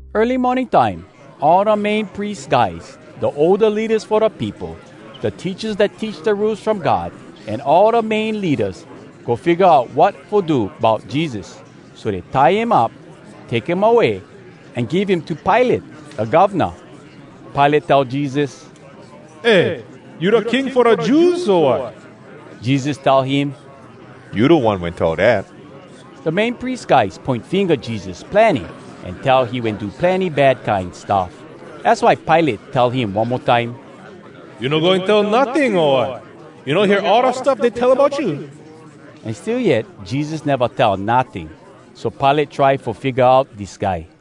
Early morning time, all da Main Pries guys, da older leadas fo da peopo, da teachas dat teach da Rules From God, an all da main leadas, go figga out wat fo do bout Jesus. So dey tie him up, take him away, an give him to Pilate, da govna. Pilate tell Jesus, “Eh, you da King fo da Jews, o wat?” Jesus tell him, “You da one wen tell dat.” Da Main Pries guys poin finga Jesus plenny an tell he wen do plenny bad kine stuff. Az why Pilate tell him one mo time, “You no goin tell notting, o wat? You no hear all da stuff dey tell bout you?” An still yet Jesus neva tell notting. So Pilate try fo figga out dis guy.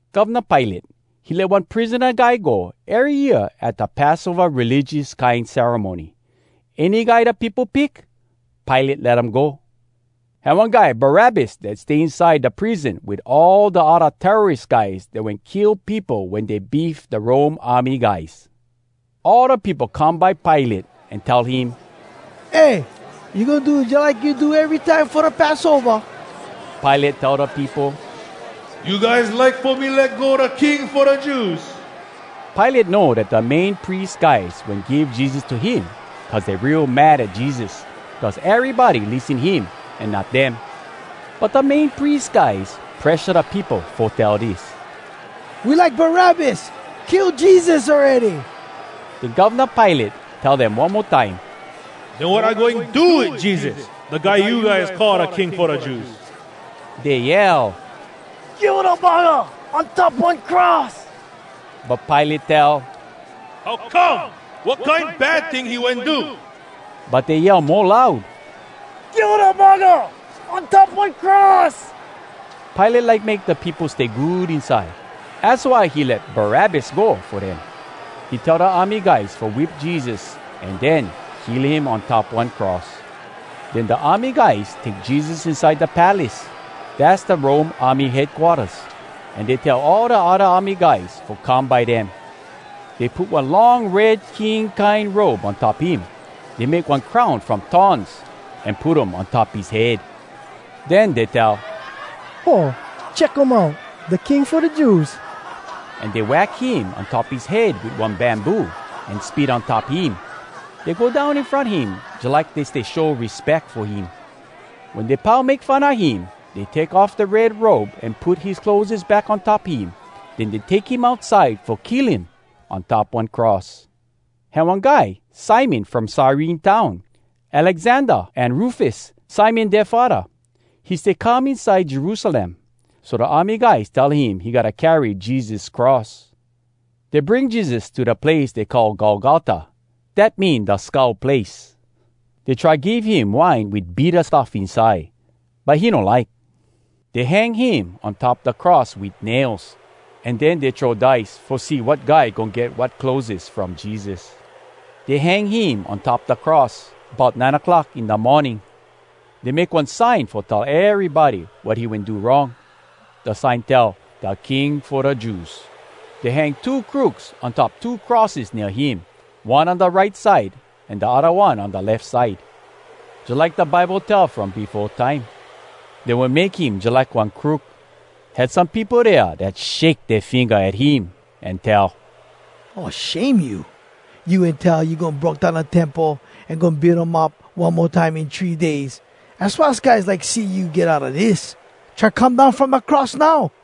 Govna Pilate, he let one prisona guy go ery year at da Passova religious kine ceremony. Any guy da peopo pick, Pilate let um go. Had one guy Barabbas dat stay inside da prison wit all da odda terroris guys dat wen kill peopo wen dey beef da Rome army guys. All da peopo come by Pilate an tell him, “Eh, you goin do jalike you do erytime fo da Passova?” Pilate tell da peopo, “You guys like fo me let go da King fo da Jews?” Pilate know dat da Main Pries guys wen give Jesus to him cuz dey real mad at Jesus, cuz erybody lissen him an not dem. But da Main Pries guys presha da peopo fo tell dis: “We like Barabbas! Kill Jesus awready!” Den Govna Pilate tell dem one mo time, “Den wat I goin do wit Jesus, da guy you guys call da King fo da Jews?” Dey yell, “Kill da buggah on top one cross!” But Pilate tell, “How come? Wat kine bad ting he wen do?” But dey yell mo loud, “Kill da buggah on top one cross!” Pilate like make da peopo stay good inside. Az why he let Barabbas go fo dem. He tell da army guys fo whip Jesus an den kill him on top one cross. Den da army guys take Jesus inside da palace, dass da Rome army headquarters, an dey tell all da odda army guys fo come by dem. Dey put one long red king kine robe on top him. Dey make one crown from thorns, an put um on top his head. Den dey tell, “Ho! Check um out! Da King fo da Jews!” An dey wack him on top his head wit one bamboo, an spit on top him. Dey go down in front him jalike dey stay show respeck fo him. Wen dey pau make fun a him, dey take off da red robe an put his clotheses back on top him. Den dey take him outside fo kill him on top one cross. Had one guy Simon from Cyrene town. Alexander an Rufus, Simon dea faddah. He stay come inside Jerusalem. So da army guys tell him he gotta carry Jesus cross. Dey bring Jesus to da place dey call Golgota. Dat mean “Da Skull Place.” Dey try give him wine wit bitta stuff inside, but he no like. Dey hang him on top da cross wit nails, an den dey throw dice, fo see wat guy goin get wat clotheses from Jesus. Dey hang him on top da cross bout nine clock in da morning. Dey make one sign fo tell erybody wat he wen do wrong. Da sign tell, Da King Fo Da Jews Dey hang two crooks on top two crosses nea him, one on da right side an da odda one on da lef side. [Jalike da Bible tell from befo time, “Dey wen make him jalike one crook.”] Had some peopo dea dat shake dea finga at him an tell, “Oh, shame you! You wen tell you goin broke down da Temple an goin build um up one mo time in three days! Az why us guys like see you get outa dis! Try come down from da cross, now!”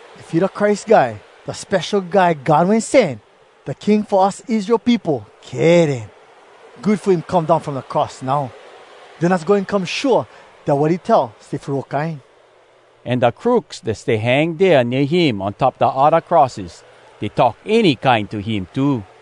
If he da Christ Guy, da Spesho Guy God Wen Sen, da King fo us Israel peopo, kay den, good fo him come down from da cross now! Den us goin come shua dat wat he tell stay fo real kine!” An da crooks dat stay hang dea nea him on top da odda crosses, dey talk any kine to him too.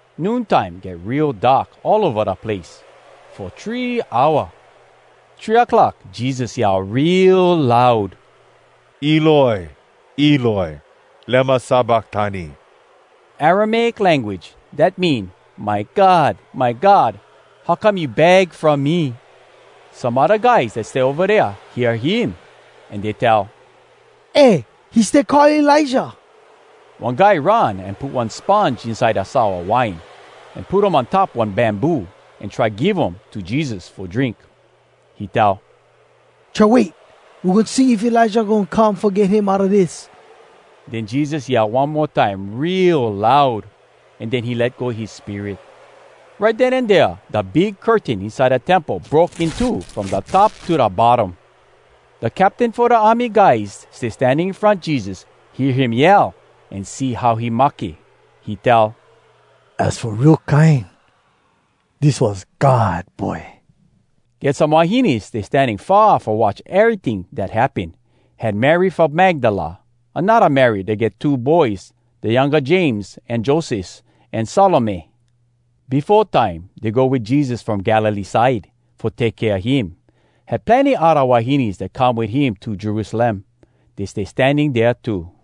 Noon time get real dark all ova da place, fo three hour. Three clock Jesus yell real loud, “Eloi, eloi, lema sabaktani!” Aramaic language dat mean, “My God, my God, how come you bag from me?” Some odda guys dat stay ova dea hear him, an dey tell, “Eh! He stay call Elijah!” One guy run an put one sponge inside da sour wine, an put um on top one bamboo, an try give um to Jesus fo drink. He tell, “Try wait! We goin see if Elijah goin come fo get him outa dis.” Den Jesus yell one mo time real loud, an den he let go his spirit. Right den an dea da big curtain inside da Temple broke in two from da top to da bottom. Da captain fo da army guys stay standing in front Jesus hear him yell an see how he mahke. He tell, “Az fo real kine, dis was God Boy!” Get some wahines stay standing far fo watch eryting dat happen. Had Mary from Magdala, anodda Mary dat get two boys (da younga James an Joses), an Salome. Befo time, dey go wit Jesus from Galilee side, fo take kea him. Had plenny odda wahines dat come wit him to Jerusalem. Dey stay standing dea too.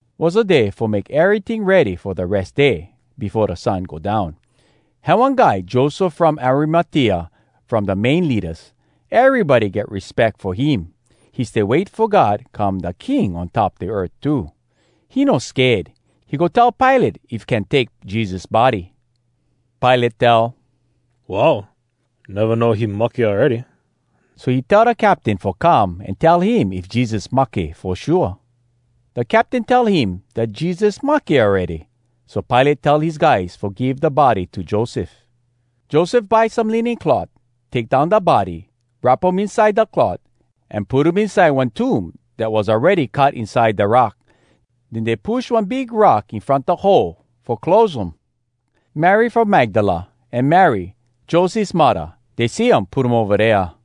Was da day fo make eryting ready fo da Res Day, befo da sun go down. Had one guy, Joseph from Arimatea, from da main leadas. Erybody get respeck fo him. He stay wait fo God come da King on top da earth too. He no sked. He go tell Pilate if can take Jesus body. Pilate tell, “Wow! I neva know he mahke awready!” So he tell da captain fo come an tell him if Jesus mahke fo shua. Da captain tell him dat Jesus mahke awready, so Pilate tell his guys fo give da body to Joseph. Joseph buy some linen cloth, take down da body, wrap um inside da cloth, an put um inside one tomb dat was awready cut inside da rock. Den dey push one big rock in front da hole fo close um. Mary from Magdala an Mary, Joses muddah, dey see um put him ova dea.